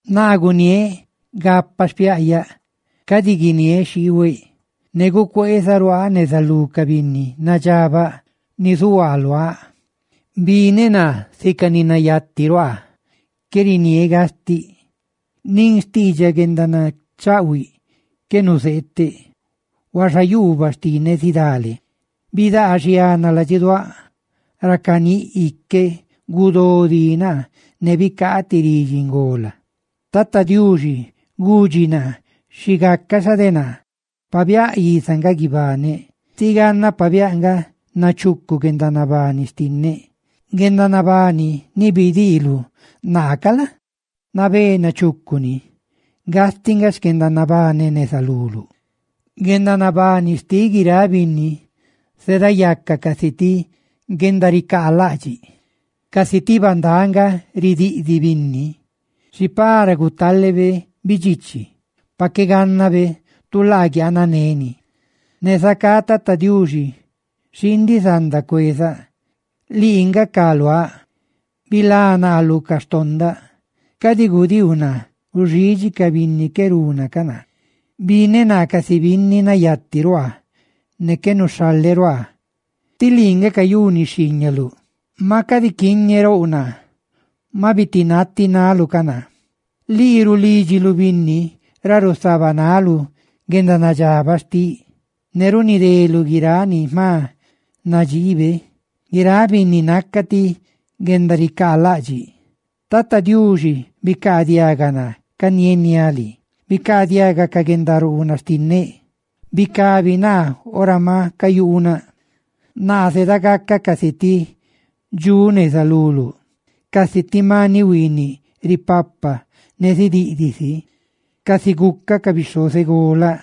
Naa guniéꞌ gapaꞌ xpiaꞌyaꞌ, ne cadi gucheeniáꞌ ludxeꞌ, ne gucueezaꞌ ruaaꞌ neza lú ca binni nadxabaꞌ ni zuhuaa luáꞌ. Bineꞌ naa sica ni nayati ruaa: qué niniéꞌ gastiꞌ. ¡Nin xtiidxaꞌ guendanachaꞌhuiꞌ qué nuzeeteꞌ! Huaxa yuubaꞌ xtinneꞌ zidale; ¡bidaa xiana ladxiduáꞌ! Ra caníꞌ iqueꞌ, gudó dí naa, ne bicaa ti ridxi ngola: «Tata Diuxi gudxi naa xi gaca xa de naa pabiáꞌ iza nga guibaneꞌ, tí ganna pabiáꞌ nga nachucu guendanabani xtinneꞌ. Guendanabani ni bidiiluꞌ naa ca la? nabé nachucuni; gastiꞌ nga xquendanabaneꞌ neza luluꞌ. ¡Guendanabani xtiꞌ guiráꞌ binni zeedayaca casi ti guendaricaalaꞌdxiꞌ! ¡Casi ti bandáꞌ nga ridiꞌdiꞌ binni! Xi para gutalebe bidxichi, pa qué gánnabe tu laa guiananeni. Ne zacá, Tata Diuxi, xiindiꞌ zanda cuezaꞌ, ¡Lii nga ca luá! Bilá naa lu ca xtondaꞌ; cadi gudiiu naa guxidxi ca binni qué riene ca naa. »Bineꞌ naa casi binni nayati ruaa ne qué nuxhaleꞌ ruaaꞌ, tí lii nga cayuni xhiiñaluꞌ. Maꞌ cadi quiñerouꞌ naa; maꞌ bitinati naꞌluꞌ ca naa. Lii rulídxiluꞌ binni ra rusabanaluꞌ guendanadxabaꞌ xtiꞌ, ne runideluꞌ guiráꞌ ni jma nadxiibe. ¡Guiráꞌ binni naca ti guendaricaalaꞌdxiꞌ! »Tata Diuxi, bicaadiaga naa canieniáꞌ lii, ¡bicaadiaga ca guenda ruunaꞌ xtinneꞌ!, ¡bicabi naa ora ma cuyuunaꞌ! Naa zedagacaꞌ casi ti dxuꞌ neza luluꞌ, casi ti maniꞌ huiiniꞌ ripapa ne zidiꞌdiꞌ si, casi gucaꞌ ca bixhozeꞌ golaꞌ.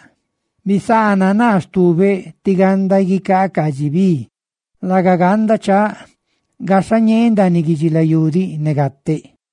Bisaana naa stubeꞌ tí ganda guicaaꞌ caadxi bi, laga ganda chaaꞌ, gaxhañee ndaaniꞌ guidxilayú diꞌ ne gateꞌ.»